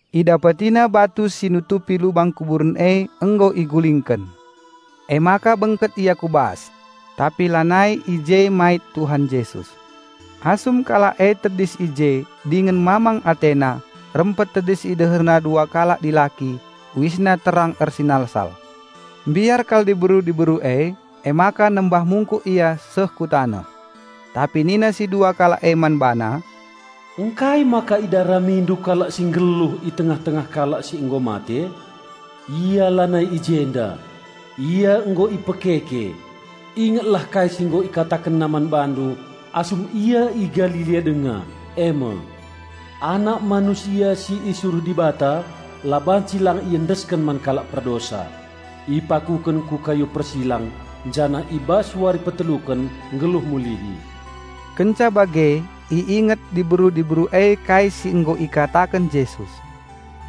Idapetina batu si nutupi lubang kuburen e nggo igulingken. Emaka bengket ia ku bas; tapi lanai i je mait Tuhan Jesus. Asum kalak e tedis i je dingen mamang atena, rempet tedis i deherna dua kalak dilaki, uisna terang ersinalsal. Mbiar kal diberu-diberu e, emaka nembah mungkuk ia seh ku taneh. Tapi nina si dua kalak e man bana, "Ngkai maka idaramindu Kalak si nggeluh i tengah-tengah kalak si nggo mate? Ia lanai i jenda; Ia nggo ipekeke. Ingetlah kai si nggo IkatakenNa man bandu asum Ia i Galilea denga, e me, 'Anak Manusia si isuruh Dibata la banci lang iendesken man kalak perdosa, ipakuken ku kayu persilang janah i bas wari peteluken nggeluh mulihi.'" Kenca bage i inget diberu-diberu e kai si nggo ikataken Jesus.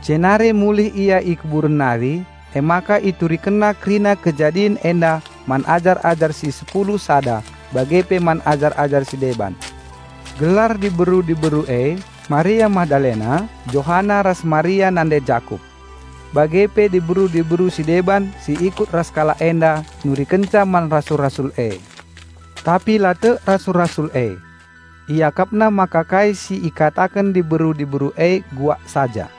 Jenari mulihken ia i kuburen nari emaka iturikenna kerina kejadin enda man ajar-ajar si sepulu sada bage pe man ajar-ajar si deban. Gelar diberu-diberu e: Maria Magdalena, Johana ras Maria nande Jakup. Bage pe diberu-diberu si deban si ikut ras kalak enda nurikenca man rasul-rasul e. Tapi la tek rasul-rasul e. Iakapna maka kai si ikataken diberu-diberu e bual saja.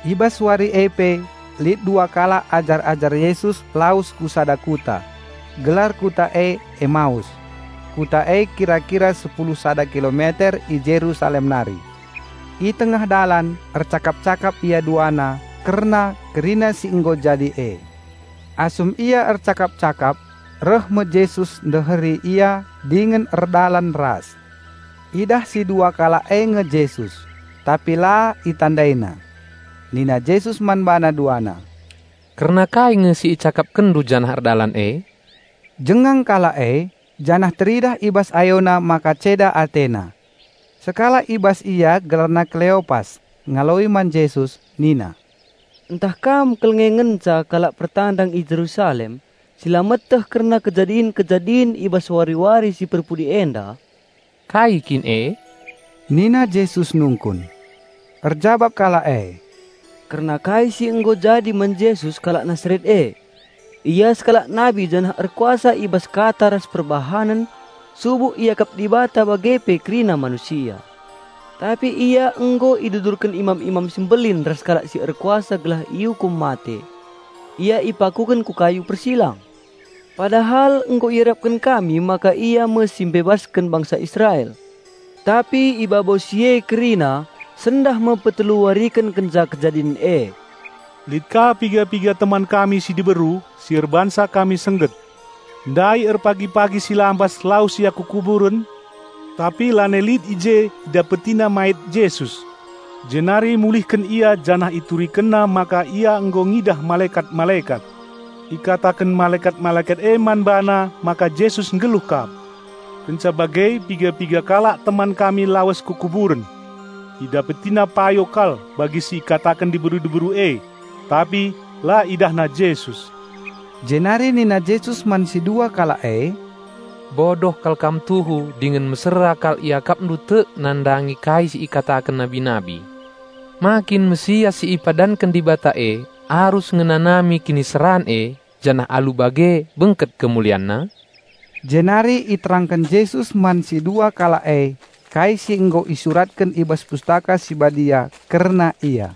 I bas wari e pe lit dua kalak ajar-ajar Jesus lawes ku sada kuta. Gelar kuta e Emaus. Kuta e kira-kira sepulu sada kilometer i Jerusalem nari. I tengah dalan ercakap-cakap ia duana kerna kerina si nggo jadi e. Asum ia ercakap-cakap, reh me Jesus ndeheri ia dingen erdalan ras. Idah si dua kalak e nge Jesus, tapi la itandaina. Nina Jesus man bana duana, "Kerna kai nge si icakapkenndu janah erdalan e?" Jengang kalak e janah teridah i bas ayona maka ceda atena. Sekalak i bas ia gelarna Keleopas ngaloi man Jesus nina, "Ntah kam kal nge ngenca kalak pertandang i Jerusalem si la meteh kerna kejadin-kejadin i bas wari-wari si perpudi enda?" "Kai kin e?" nina Jesus nungkun. Erjabap kalak e, "Kerna kai si nggo jadi man Jesus kalak Nasaret e. Ia sekalak nabi janah erkuasa i bas kata ras perbahanen subuk iakap Dibata bage pe kerina manusia. Tapi Ia nggo idudurken imam-imam si mbelin ras kalak si erkuasa gelah iukum mate. Ia ipakuken ku kayu persilang. Pada hal nggo iarapken kami maka Ia me si mbebasken bangsa Israel. Tapi i babo si e kerina sendah me petelu wariken kenca kejadin e. Lit ka pe piga-piga teman kami si diberu si erbahanca kami sengget. Ndai erpagi-pagi si lampas lawes ia ku kuburen, tapi lanai lit i je idapetina mait Jesus. Jenari mulihken ia janah iturikenna maka ia nggo ngidah malekat-malekat. Ikataken malekat-malekat e man bana maka Jesus nggeluh kap. Kenca bage piga-piga kalak teman kami lawes ku kuburen. Idapetina payo kal bagi si ikataken diberu-diberu e. Tapi la idahna Jesus." Jenari nina Jesus man si dua kalak e, "Bodoh kal kam tuhu dingen mesera kal iakapndu tek nandangi kai si ikataken nabi-nabi. Ma kin Raja Penampat si ipadanken Dibata e arus ngenanami kiniseran e janah alu bage bengket KemulianNa?" Jenari iterangken Jesus man si dua kalak e kai si nggo isuratken i bas Pustaka Si Badia kerna Ia,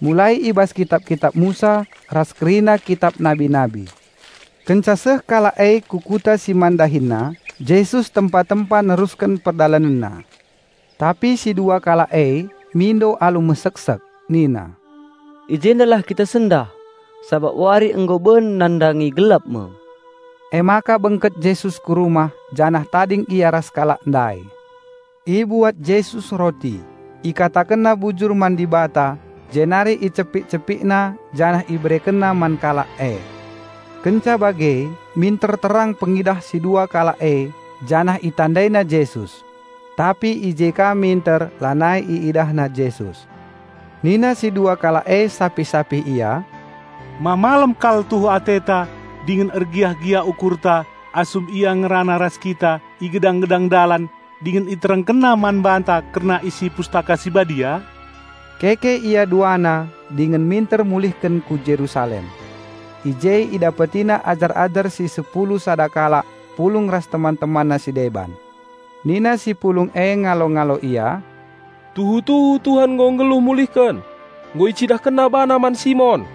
mulai i bas kitap-kitap Musa ras kerina kitap nabi-nabi. Kenca seh kalak e ku kuta si man dahinna, Jesus tempa-tempa nerusken PerdalanenNa. Tapi si dua kalak e mindo alu meseksek nina, "I jendalah kita sendah, sabap wari nggo ben nandangi gelap me." Emaka bengket Jesus ku rumah janah tading Ia ras kalak ndai. Ibuat Jesus roti, IkatakenNa bujur man Dibata jenari icepik-CepikNa janah IberekenNa man kalak e. Kenca bage minter terang pengidah si dua kalak e janah itandaina Jesus. Tapi i je ka minter lanai iidahna Jesus. Nina si dua kalak e sapih-sapih ia, "Ma malem kal tuhu ateta dingen ergiah-giah ukurta asum Ia ngerana ras kita i gedang-gedang dalan dingen IterangkenNa man banta kerna isi Pustaka Si Badia?" Keke ia duana dingen minter mulihken ku Jerusalem. I je idapetina ajar-ajar si sepulu sada kalak pulung ras teman-temanna si deban. Nina si pulung e ngalo-ngalo ia, "Tuhu-tuhu Tuhan nggo nggeluh mulihken! Nggo IcidahkenNa BaNa man Simon."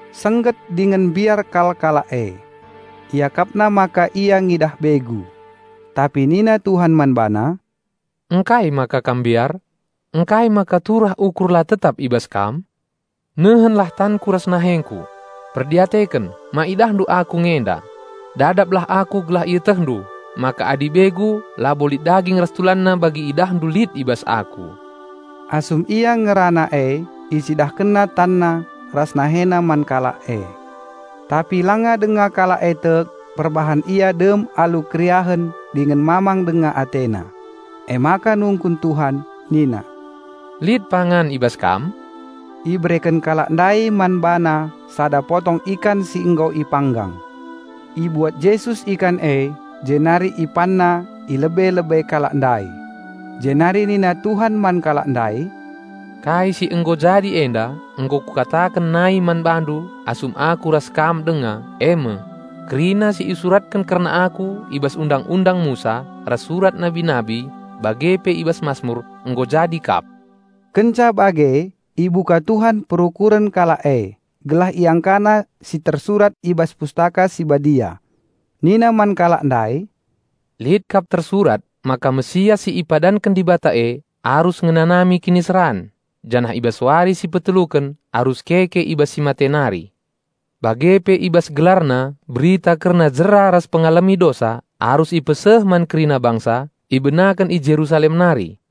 Sengget dingen mbiar kal kalak e. Iakapna maka ia ngidah begu. Tapi nina Tuhan man bana, "Ngkai maka kam mbiar? Ngkai maka turah ukur la tetap i bas kam? Nehenlah tanKu ras nahengKu. Perdiateken, ma idahndu Aku nge enda. Dadaplah Aku gelah ietehndu maka adi begu labo lit daging ras tulanna bagi iidahndu lit i bas Aku." Asum Ia ngerana e IcidahkenNa TanNa ras NaheNa man kalak e. Tapi langa denga kalak e tek perbahan ia dem alu keriahen dingen mamang denga atena; emaka nungkun Tuhan nina, "Lit pangan i bas kam?" Ibereken kalak ndai man BaNa sada potong ikan si nggo ipanggang. Ibuat Jesus ikan e jenari IpanNa i lebe-lebe kalak ndai. Jenari nina Tuhan man kalak ndai, "Kai si nggo jadi enda nggo Kukataken nai man bandu asum Aku ras kam denga e me: Kerina si isuratken kerna Aku i bas Undang-undang Musa ras surat nabi-nabi bage pe i bas Masmur nggo jadi kap." Kenca bage ibuka Tuhan perukuren kalak e gelah iangkana si tersurat i bas Pustaka Si Badia. Nina man kalak ndai, "Lit kap tersurat maka Raja Penampat si ipadanken Dibata e arus ngenanami kiniseran, janah i bas wari si peteluken arus keke i bas si mate nari. Bage pe i bas GelarNa berita kerna jera ras pengalemi dosa arus ipeseh man kerina bangsa, ibenaken i Jerusalem nari.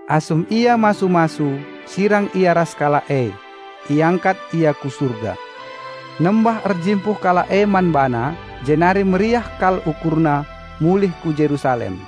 Asum Ia masu-masu, sirang Ia ras kalak e; iangkat Ia ku Surga. Nembah erjimpuh kalak e man BaNa, jenari meriah kal ukurna mulih ku Jerusalem.